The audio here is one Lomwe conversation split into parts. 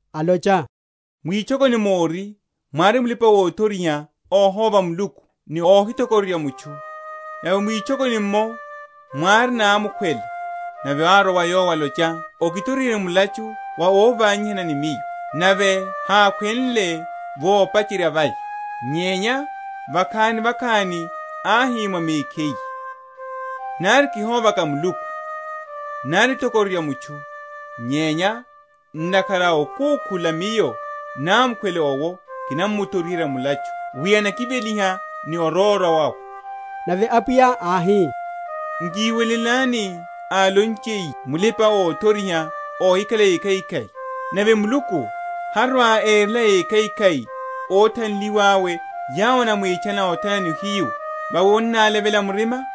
alocha, Mwitchokoni móri mwári mulipa‐othoriha óhóva Muluku, ni óhithokororya mutchu. Nave mwitchokoni’mmo mwári námukhwele; nave árwa wa yowo alocha, Okithoriherye mulachu wa óvanyihana ni miyo. Nave hákhwenle vopacherya vaya; nyenya vakhani ni vakhani áhi mwa mekhiye, Nari kihóvaka Muluku, nari othokororya mutchu; nyenya ntakhara a okúkhula miyo námukhwele owo kinamuthoriherya mulachu, wi anakiveliha ni orwórwa wawe. Nave Apwiya áhi, Nkiwelelani álonchiye mulipa‐othoriha óhikhala ékhaikhai. Nave Muluku harwa‐erela ekhaikhai óthanliwa awe yawo enamwitchana othana ni ohiyu, vawi annálevela murima?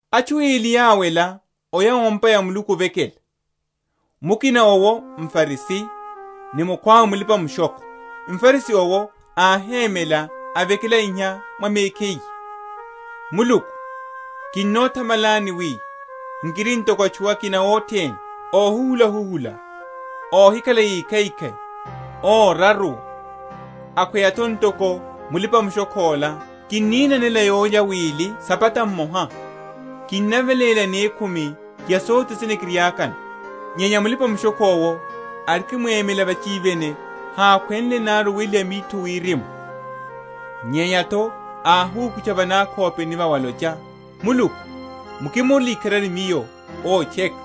Atchu eli yáwela oya o’mpa ya Muluku ovekela; mukina owo mFarisi ni mukhwawe mulipa‐mushokho. MFarisi owo áhémela avekela iha mwa mekhiye, Muluku, kinnothamalani wi nkiri ntoko atchu akina othene, óhuhula‐huhula, óhikhala ékhaikhai, óraruwa, akhweya’tho ntoko mulipa‐mushokho’la; kininanela yólya wili sabata mmoha; kinaveléla yanekhumi ya sothe sene kiriákano. Nyenya mulipa‐mushokho’wo arikimwemela vachivene hákhwenle nari oweliha mitho wirimu, nyenya’tho áhisúkutcha va nakhopeni vawe alocha, Muluku, mukimorele ikharari miyo ótcheka.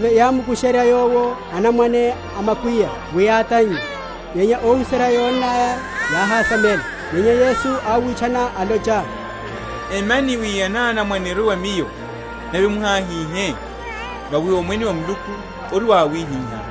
Nave yámukusherya Yowo anamwane a makwiya wi átannye; nyenya óhuserya yónnaya, yáhásamela. Nyenya Yesu áwitchana, alocha, Emyani anamwane erwe wa Miyo, nave muháhihe: vawi Omwene wa Muluku ori wa awihiha.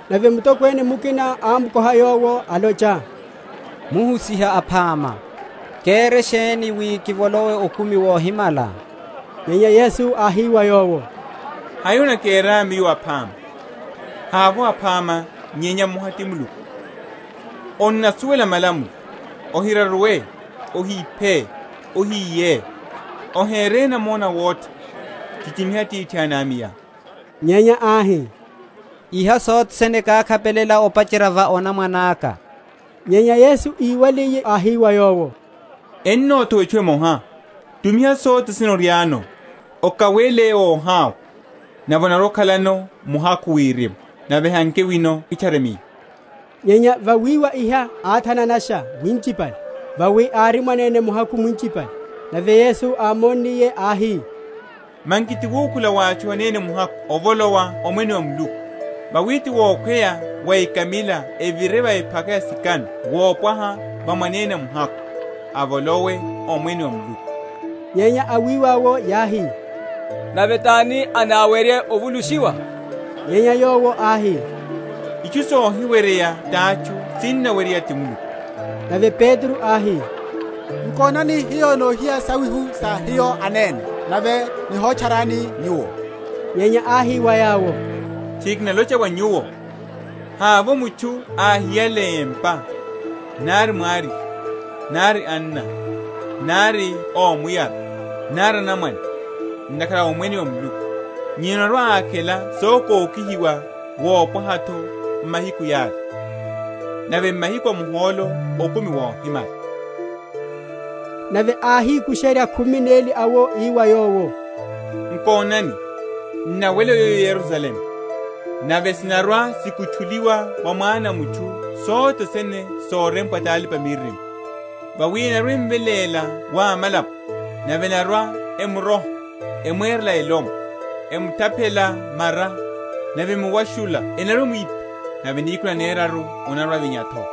Nave mutokwene mukina ámukoha Yowo, alocha, Muhusiha aphama, kere sheni, wi kivolowe okumi wohimala? Nyenya Yesu áhi wa yowo, Hai onakerá Miyo aphama? havovo aphama, nyenya mmoha, ti Muluku. Onnasuwela malamulo, Ohiraruwe; Ohiphe; Ohiye; Ohere namona awotha, Chichimiha atithá ni amayá. Nyenya áhi, Iha sothe sene kákhapelela opacherya va onamwane aka. Nyenya Yesu íwaliye, áhi wa yowo, Enothowa etchu emoha: tumiha sothe sene oriáno, okawele óhawa; nave onarwa‐okhalano muhakhuhakhu wirimu; nave hanke wino, kitchare Miyo. Nyenya vawiwa iha áthananasha winchipale; vawi ári mwanene muhakhu mwinchipale. Nave Yesu ámonniye áhi, Manki ti wukhula wa atchu anene muhakhu ovolowa omwene wa Muluku! Vawi ti wokhweya wa ekamila evire va ephaka ya sikano wopwaha wa mwanene muhakhu, avolowe omwene wa Muluku. Nyenya awiwa’wo yáhi, Nave tani anáwerye ovulushiwa? Nyenya Yowo áhi, Itchu sohiweryeya tatchu sinaweryeya ti Muluku. Nave Petro áhi, Nkonani hiyo nohiya sauhu sa hiyo anene, nave nihotcharani Nyuwo. Nyenya áhi wa yawo, Tchiri kinalocha wa nyuwo, Havovo mutchu áhiyale empa, nari mwariye, nari anna, nari ómuyara, nari anamwane, ntakhara a omwene wa Muluku, nyenya anarwa‐akhela sokokihiwa wopwaha’tho m’mahiku yala; nave m’mahiku a muhólo okumi wohimala. Sa ohoshiwa wa Yesu. Nave áhikusherya khumi neli awo, ii wa yawo, Nkonani, n’nawela oya o Yerusalemu, nave sinarwa‐sikutchuliwa wa Mwana a mutchu sothe sene sorempwa ti alipa‐miririmo. Vawi enarwa‐emveléla wa amalapo, nave enarwa‐emuroha, emwerela elomwe, emutaphela mara: nave emuwashunle enarwa‐emwipha; nave nihiku naneraru anarwa‐avinya’tho.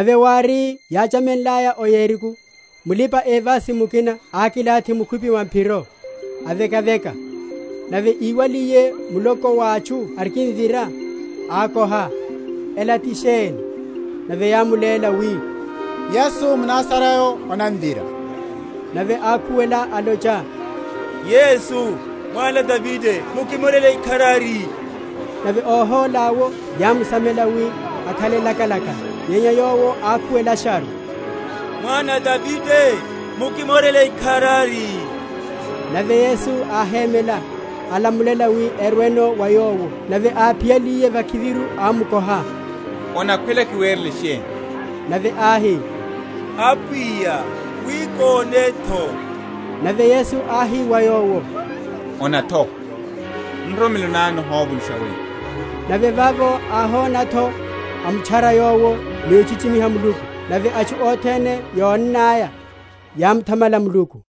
Nave wári yáchamenlaya o Yeriko, mulipa‐evasi mukina ákilathi mukhwipi mwa’phiro, avekaveka; nave íwaliye muloko wa atchu orikimvira, ákoha, Ela ti sheni? Nave yámuléla, wi, Yesu mNazarayo anamvira. Nave ákhuwela, alocha, Yesu, Mwana a Davide, mukimorele ikharari. Nave óhola’wo yámsamela, wi akhale lakalaka; nyenya yowo ákhuwelasharu, Mwana a Davide, mukimorele ikharari. Nave Yesu áhémela, alamulela wi erweno wa Yowo: nave áphiyaliye vakhiviru, ámukoha, Onakhwela kiwerele sheni? Nave áhi, Apwiya, wi kone’tho. Nave Yesu áhi wa yowo, Ona’tho: nroromelo ná nihovulusha weyo. Nave vavo áhona’tho, amutchara Yowo, ni ochichimiha Muluku: nave atchu othene yónnaya, yámuthamala Muluku.